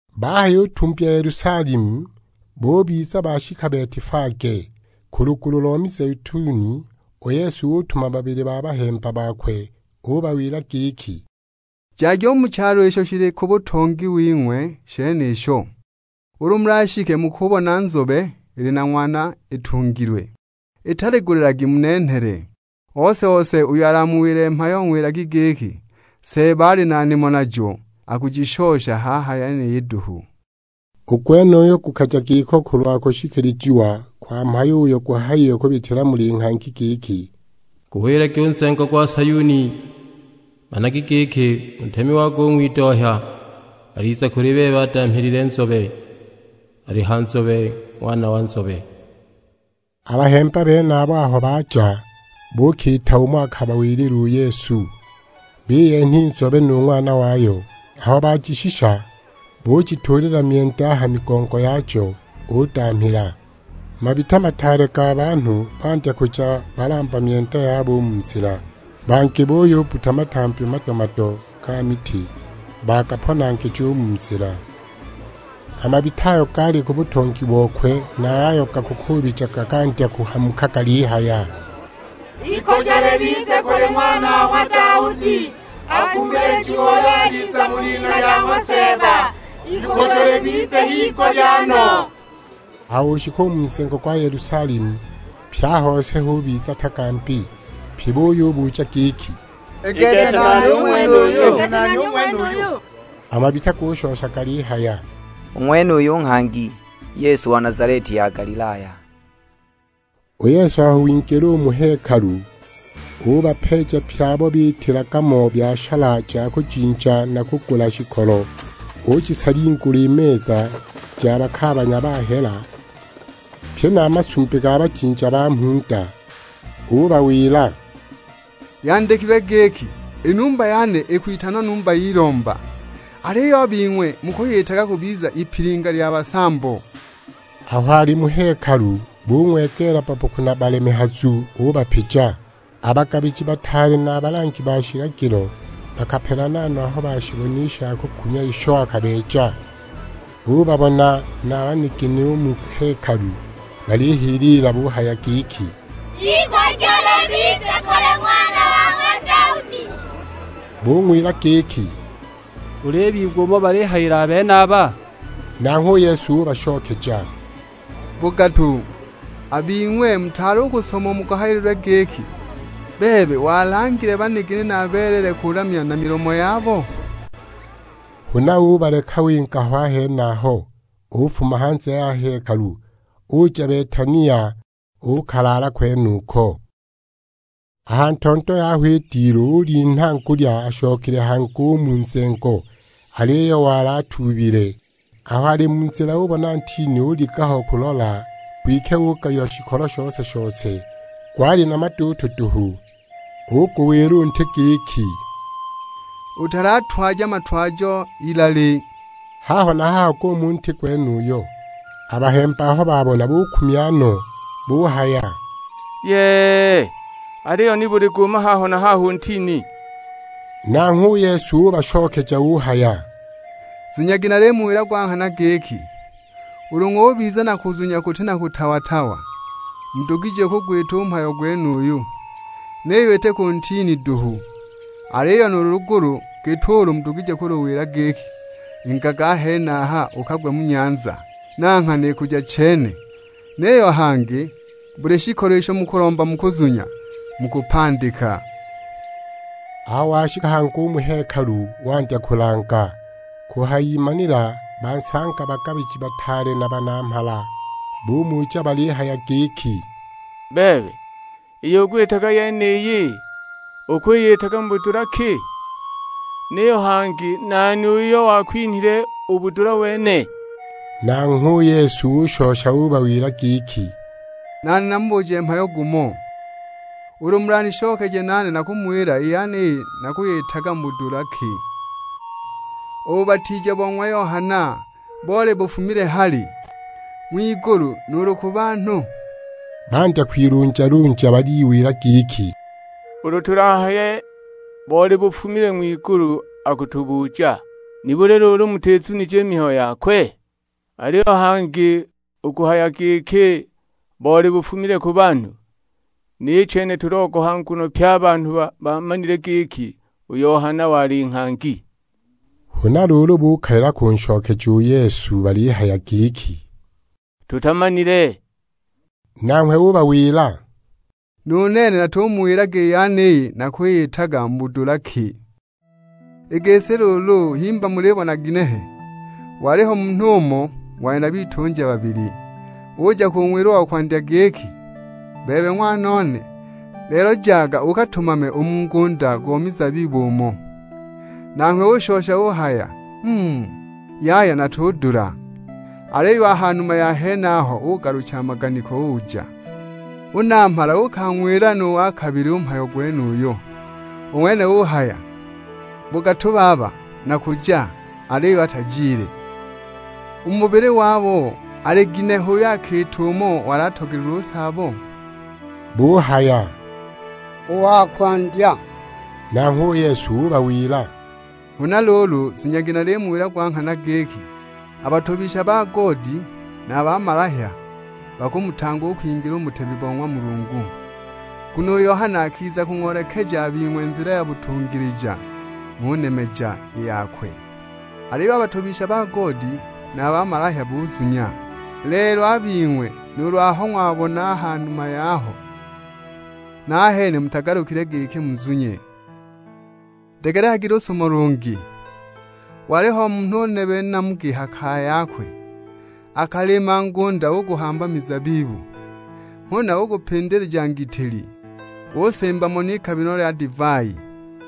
Bahayutumbya Yelusalemu, bubiza bashika Betifage, ku lugulu lo mizeituni, u Yesu utuma babili ba bahemba bakwe. Ubawila giki, "Jagi u mu chalo isho shili ku butongi wing'we shenisho, ulu mulashike mukubona nzobe ili na ng'wana itungilwe, italigulilagi munenhele. Ose-ose uyo alamuwile mhayo ng'wilagi giki, 'Seeba ali na nimo najo, akujishosha haha yeniyi duhu.' " U gwenuyo gukaja giko kulwa kushikilijiwa kwa mhayo uyo guhayiwe kubitila muli nghangi; giki, "Guwilagi u nzengo gwa Sayuni, 'Managa giki, u Ntemi wako u ng'widohya, aliza kuli bebe adamhilile nzobe; ali ha nzobe, ng'wana wa nzobe.' " A bahemba benabo aho baja, buukiita umo akabawilila u Yesu. Biyenha i nzobe nu ng'wana wayo, aho bajishisha bujituulila myenda a ha migongo yajo, udamhila. Mabita mataale ga banhu bandya kuja balamba myenda yabo u mu nzila, bangi buyubbuta matambi mado-mado ga miti bagaponangija u mu nzila. A mabita ayo gaali u ku butongi bokwe na a yayo gakuubijaga gandya kuhamuka galihaya; "Ikujo libize u kuli Ng'wana wa ng'wa Daudi. Akumilijiwe uyo aliza mu lina lya ng'wa Seeba; ikujo libize higulya no!" Aho oshika u mu nzengo gwa Yelusalemu, pye a hose hubiza tagambi, pyi buyibuja giki, "I gete, nani u ng'wenuyu?" A mabita gushosha galihaya, "U ng'wenuyu nghangi, Yesu wa Nazaleti ya Galilaya!" U Yesu aho wingila u mu hekalu, ubapeeja pye abo biitilaga mo byashala ja kujinja na kugula shikolo, ujisalingula i meza ja bakaabanya ba hela, pye na a masumbi ga bajinja ba mhunda. Ubawila; "Yandikilwe giki, 'I numba yane ikwitanwa numba y'ilomba; aliyo a bing'we mukwiyitaga kubiza ipilinga lya basambo!' " Aho ali mu hekalu bung'wegeela babboku na balemehazu, ubapija. A bagabiji bataale na a balangi ba shilagilo bakapelana no aho bashibona i shakukumya isho akabeeja; bubabona na banigini u mu hekalu balihiliila buhaya giki, "Ikujo libize kuli Ng'wana wa ng'wa Daudi!" Bung'wila giki, "Ulibigwa umo balihayila a benaba?" Nanghwe u Yesu ubashokeja; "Bugatu! A bing'we mutaali u kusoma umo guhayililwe giki, 'Bebe walangile banigini na beleele kulamya na milomo yabo?' " Huna ubaleka winga ho a henaho, ufuma hanze ya hekalu, uja Betania uukalaala kwenuko. A ha ntondo yaho i dilu ulinha ngulya ashokile hangi u mu nzengo, aliyo wali atuubile. Aho ali mu nzila ubona ntini, uliga ho kulola; kwike ugayiwa shikolo shose-shose, gwali na maduutu duhu. Uguwila u nti giki, "Utalatwaja matwajo ilali!" Haho na haho guuma u ntini gwenuyo! A bahemba aho babona bukumya no, buhaya, "Yee, aliyo nibuli guuma haho na haho u ntini?" Nanghwe u Yesu ubashokeja uhaya, "Zunyagi nalimuwila gwa nghana giki, ulu ng'ubiza na kuzunya kuti na kutawa-tawa, mudugije kugwita u mhayo gwenuyu; niyo iti ku ntini duhu, aliyo nuulu lugulu git'ulu mudugije kuluwila giki, 'Ingaga a henaho ukagwe mu nyanza,' na nghana ikuja chene. Niyo hangi buli shikolo isho mukulomba mu kuzunya, mukupandika." Aho washika hangi u mu hekalu wandya kulanga, kuhayimanila bansanga bagabiji bataale na banamhala; bumuja balihaya giki, "Bebe, iyo ukwiyitaga yeniyi, ukwiyitaga mu budula ki? Niyo hangi nani uyo wakwinhile u budula wene?" Nanghwe u Yesu ushosha ubawila giki, "Nane namubuje mhayo gumo, ulu mulanishokeje nane nakumuwila i yeniyi nakwiyitaga mu budula ki. U bubatiija bo ng'wa Yohana, boli bufumile hali? Ng'wigulu, nuulu ku banhu?" Bandya kwilunjalunja baliwila giki, "Ulu tulahaye boli bufumile ng'wigulu akutubuja, 'Nibuli luulu mutizunije i mihayo yakwe?' Aliyo hangi u kuhaya giki, 'Boli bufumile ku banhu,' ni chene tulogoha, nguno pye a banhu bamanile giki u Yohana wali nghangi." Huna luulu bukalila kunshokeja u Yesu balihaya giki, "Tutamanile!" Nanghwe ubawila, "Nu nene natumuwilaga i yeniyi nakwiyitaga mu budula ki." "I gisi luulu, himba mulibona ginehe? Waliho munhu umo, wali na bitunja babili. Uja kung'wila u wa kwandya giki, 'Bebe ng'wanone, lelo jaga ukatumame u mu ngunda go mizabibu umo.' Nanghwe ushosha uhaya; 'Mm, yaya natudula!' Aliyo a ha numa ya henaho ugalucha a maganiko uja. U namhala uukang'wila nu wa kabili u mhayo gwenuyo; u ng'wene uhaya, 'Bugatu baba, nakuja;' aliyo atajile. U mu bubili wabo, ali ginehe uyo akiita umo wali atogelilwe u saabo?" Buhaya, "U wa kwandya!" Nanghwe u Yesu ubawila; "Huna luulu zunyagi nalimuwila gwa nghana giki, a batobisha ba goodi na a bamalahya bakumutanga u kwingila u mu butemi bo ng'wa Mulungu. Nguno u Yohana akiza kung'oolekeja a bing'we nzila ya butungilija ng'unemeja i yakwe; aliyo a batobisha ba goodi na a bamalahya buzunya. Lelo a bing'we nuulu aho ng'wabona a ha numa yaho, nahene mutagalukile giki muzunye!" "Degelekagi lusumo lungi, oliho munhu nebe namugi ha kaya yakwe, akalima ngunda uguhamba mizabibu, huna ugupindilija ngitili, usimba mo n'ikamilo lya divai.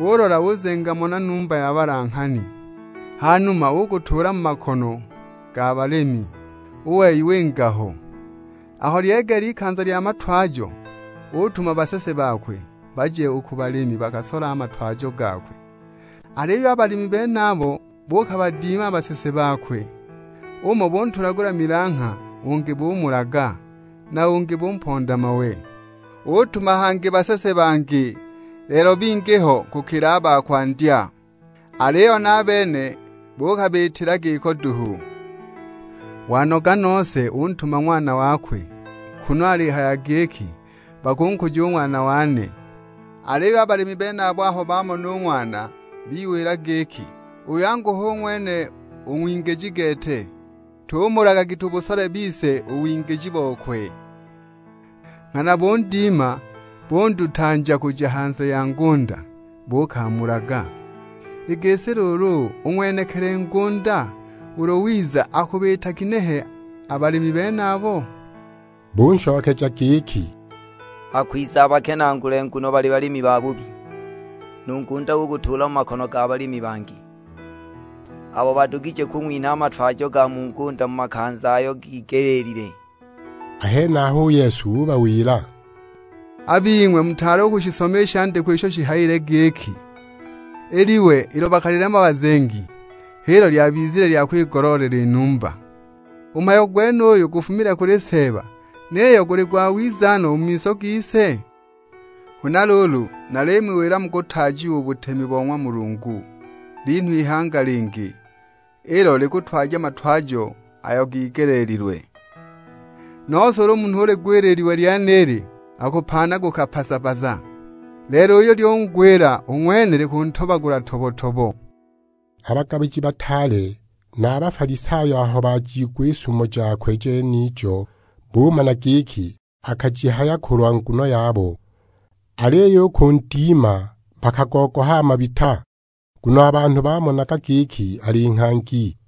Ulola uzenga mo na numba ya balanghani, hanuma ugutuula mu makono ga balimi, u wei winga ho. Aho lyegeela ikanza lya matwajo, utuma basese bakwe, baje u ku balimi bakasole a matwajo gakwe. Aliyo a balimi benabo buukabadima a basese bakwe; umo buntulagula milangha, ungi bumulaga, na ungi bumponda mawe. Utuma hangi basese bangi, lelo bingi ho kukila a ba kwandya; aliyo na a bene buukabiitila giko duhu. Wanoga nose untuma ng'wana wakwe, kunu alihaya giki, 'Bakunkuja u ng'wana wane!' Aliyo a balimi benabo aho bamona u ng'wana, biwila giki, 'Uyu angu hu ng'wene u ng'wingiji gete, tumulagagi tubusole bise u wingiji bokwe!' Nghana bundima, bundutanja kuja hanze ya ngunda, buukamulaga! I gisi luulu, u ng'wenekili ngunda ulu wiza, akubiita ginehe a balimi benabo?" Bunshokeja giki, "Akwiza abakenaagule nguno bali balimi babubi, nu ngunda ugutuula mu makono ga balimi bangi, abo badugije kung'winha a matwajo ga mu ngunda mu makanza ayo gigelile." A henaho u Yesu ubawila; "A bing'we mutaali u kushisoma i shandikwa isho shihayile giki, 'I liwe ilo bakalilema bazengi h'ilo lyabizile lya kwigoloolela i numba; u mhayo gwenuyu gufumile kuli Seeba, niyo guli gwawiza no u mu miso gise?' "Huna luulu, nalimuwila mukutaajiwa u butemi bo ng'wa Mulungu, linhwe ihanga lingi; ilo likutwaja matwajo ayo gigeleelilwe. [ Nose ulu munhu uligwila i liwe lyenili, akupaanaguka paza-paza, lelo uyo lyungwila, u ng'wene likuntobagula tobo-tobo!]" A bagabiji bataale na a Bafalisayo aho bajiigwa i sumo jakwe jenijo, bumana giki akajihaya kulwa nguno yabo. Aliyo u kundima bakagogoha a mabita, nguno a banhu bamonaga giki ali nghangi.